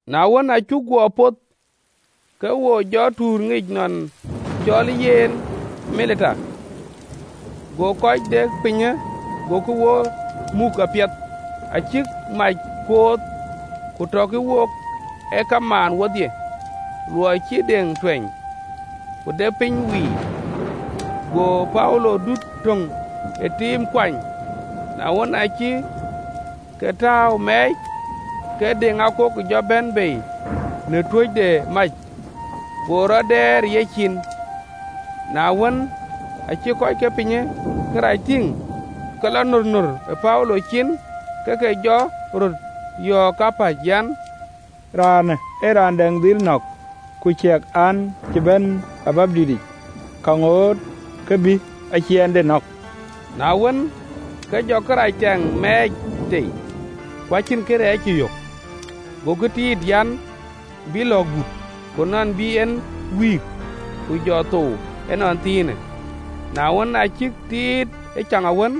Na wën, aa cuk guɔ poth, ke wo jɔ lɔ tuur ŋic nɔn cɔlë yen Malita. Go kɔc de pinyë agokï wo muk apiɛth. Acïk mac kooth, ku tɔkï wook ee kamaan wodhie, luɔi cï deŋ tuɛny, ku de piny wiir. Go Paulo dut töŋ ë tiim kuany, na wën, aacï ke tääu mɛɛc, ke deŋakook jɔ bɛ̈n bei në tuöc de mac, go rɔt dɛɛr ë yecin. Na wën, aacï kɔc ke pinyë kërac tïŋ, ke lɔ nornor ë Paulo cin, ke ke jɔ röt yɔ̈ɔ̈k kapäc an, “Raanë ë raan däŋ dhil nɔ̈k, ku ciɛk, an, cï ban ë wɛ̈ɛ̈ric, ka ŋoot ke bï aciɛɛnde nɔ̈k.” Na wën, ke jɔ kërac tɛŋ mɛɛc tei, ku cïn kërɛɛc cï yök. Gokï tiit, nɔn bï lɔ̈ɔ̈k but, ku nɔn bï en wïïk, ku jɔ thou ënɔnthiinë. Na wën, aa cïk tiit ëcaŋawën,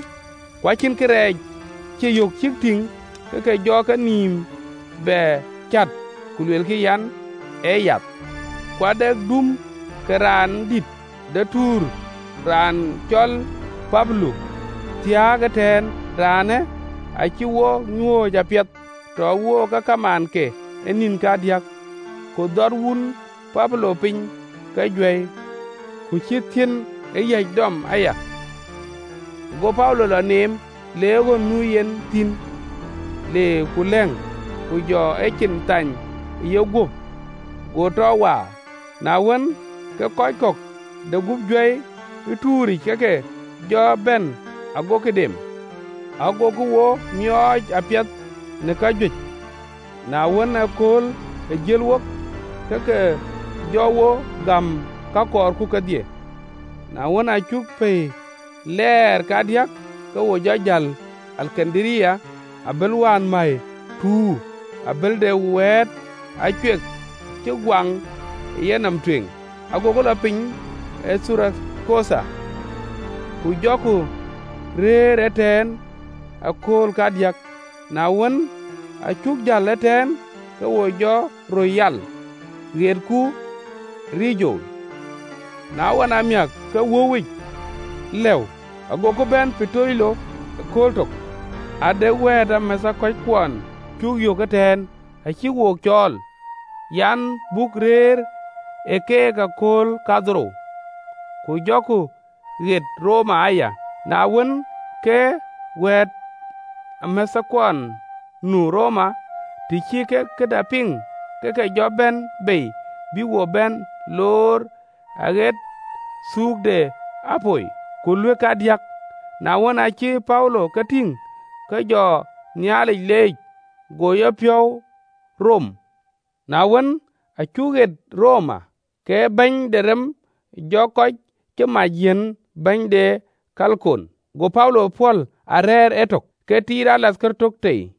ku acïn kërɛɛc cï yök cïk tïŋ, ke ke jɔ kenïïm bɛ cät, ku luelkï an, “Ee yath!” Ku ade duum ke raandït de tuur raan cɔl Pubilo, thiääk ëtɛ̈ɛ̈n, raanë acï wo nyuööc apiɛth, tɔ wook ee kamaanke ë nïn kadiäk. Ku dhɔt wun Pubilo piny ke juäi, ku cïï thiën ë yäc dɔm aya, ago Paulo lɔ neem, le ɣön nu yen thïn, le ku lɛ̈ŋ, ku jɔ ecin thany ë yeguöp, go tɔ waar. Na wën, ke kɔc de gup juäi ë tuuric ke ke jɔ bɛ̈n, agokï dem. Agokï wo miɔɔc apiɛth në kajuëc, na wën, ëkööl ë jël wok, ke ke jɔ wo gäm ka kɔɔrku kedhie. Na wën, aa cuk pɛ̈i lɛɛr kadiäk, ke wo jɔ jäl ë Alekandaria, abël wään mäi tuur, abël de wɛ̈ɛ̈t Acuek cï guaŋ ë yenɔm tueŋ. Agoku lɔ piny ë Thurakoutha, ku jɔku rëër ëtɛ̈ɛ̈n ë akööl kadiäk. Na wën, aa cuk jäl ëtɛ̈ɛ̈n, ke wo jɔ röt yal, ɣetku Regio. Na ɣɔn amiäk, ke wöuwic lëu, agoku bɛ̈n Putoli ëkööl tök. Ade wɛ̈ɛ̈tamäthkuɔn cuk yök ëtɛ̈ɛ̈n, acïk wo cɔɔl an, buk rëër ë keek ë akööl kadhorou, ku jɔku ɣet Roma aya. Na wën, ke wɛ̈ɛ̈tamäthkuɔn nu Roma, të cï kek këda piŋ, ke ke jɔ bɛ̈n bei bïk wo bɛ̈n loor aɣet Thuuk de Apio, ku Luëk kadiäk. Na wën, aacï Paulo ke tïŋ, ke jɔ Nhialic leec, go yepiɔ̈u rom. Na wën, aa cuk ɣet Roma, ke bɛ̈ny de rem jɔ kɔc cï mac yiɛ̈n bɛ̈ny ee alooc tiit, go Paulo pɔ̈l a rɛ̈ɛ̈r etök, ke tiit raan töŋ de rem tei.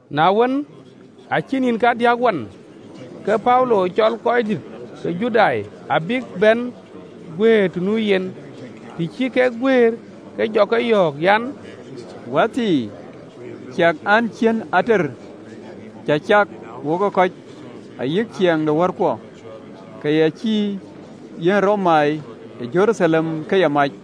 Na wën, aacï nïn kadiäk wan, ke Paulo cɔl röördït ke Judai bïk bɛ̈n guëër të nu yen. Të cï kek guëër, ke jɔ ke yɔ̈ɔ̈k an, “Wäthii, ciɛk an, cïn ater cä cak wokë kɔc, ayï ciɛɛŋ de wärkuɔ, ke yɛn cï yiɛ̈n Romai ë Jeruthalem ke ya mac.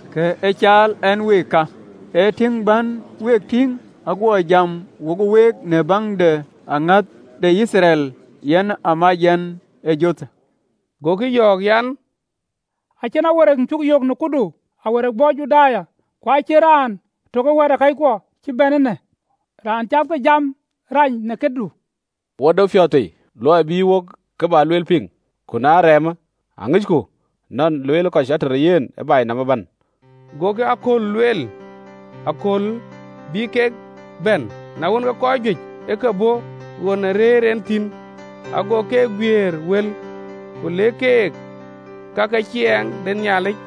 Kë ë caal ɛn week ka, ee tïŋ bän week tïŋ, aguɔ jam wo week, në baŋ de aŋäth de Yithriɛl, yen a mɛcë yɛn ë jothë.” Gokï yɔ̈ɔ̈k an, “Acïn awereek cuk yök në këdu awereek bɔ̈ Juda, ku acïn raan tök ë wɛ̈ɛ̈takëckuɔ cï bɛ̈n eenë, raan cath ke jam rac në këdu. Wo de piɔ̈ɔ̈th tei, luɔi bï wok kë bä lueel piŋ, ku na ee remë, aŋicku nɔn lueelë kɔc ater ë yen ë baai nɔm ëbɛ̈n.” Gokï akööl lueel, akööl bï kek bɛ̈n, na wën, ke kɔc juëc ë ke bɔ̈ ɣön rëër en thïn, ago keek guiëër wël, ku lëk keek ka ke ciɛɛŋ de Nhialic,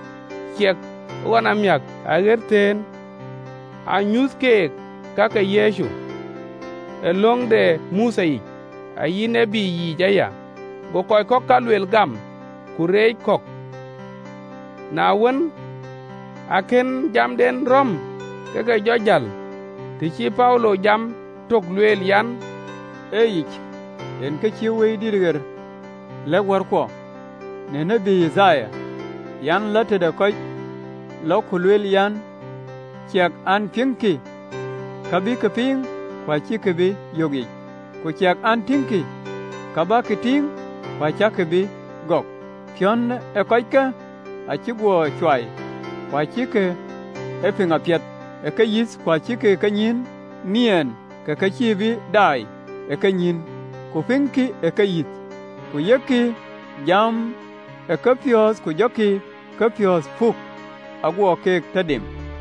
ciɛk ɣɔn amiäk aɣet thëën, anyuth keek ka ke Yecu, ë löŋ de Mothe yic ayï tït yiic aya. Go kɔc ka lueel gam, ku reec kɔ̈k. Na wën, akën jamden rɔ̈m, ke ke jɔ jäl, të cï Paulo jam tök lueel, an, “Ee yic yen kë cïï Wëidït ɣer lɛ̈k wärkuɔ në tiët Yithaya, (LXX). lueel an, ‘Lɔ tëde kɔckë, lɔ ku luel an: Ciɛk an, piɛŋkï, ka bäk piŋ, ku acäk bï yökic: Ku ciɛk an, tiëŋkï, ka bäk tïŋ, ku acäkï bï gɔɔk: Piɔ̈n ë kɔckë acï guɔ cuai, Ku acïkï ee piŋ apiɛth ë keyïth, ku acïk kenyïïn niɛɛn, Ke ke cïï bï daai ë kenyïïn, Ku pïŋkï ë keyïth, Ku yökkï jam ë kepiɔ̈ɔ̈th, Ku jɔkï kepiɔ̈ɔ̈th puk, Aguɔ keek tɔ dem.”’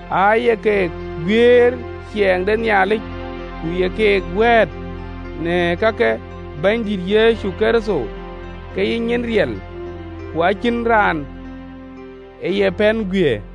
Aaye keek guiëër ciɛɛŋ de Nhialic, ku ye ke wɛ̈ɛ̈t në ka ke Bɛ̈nydït Yecu Kërtho ke ye nyin riɛl, ku acïn raan ë ye pɛ̈n guiëër.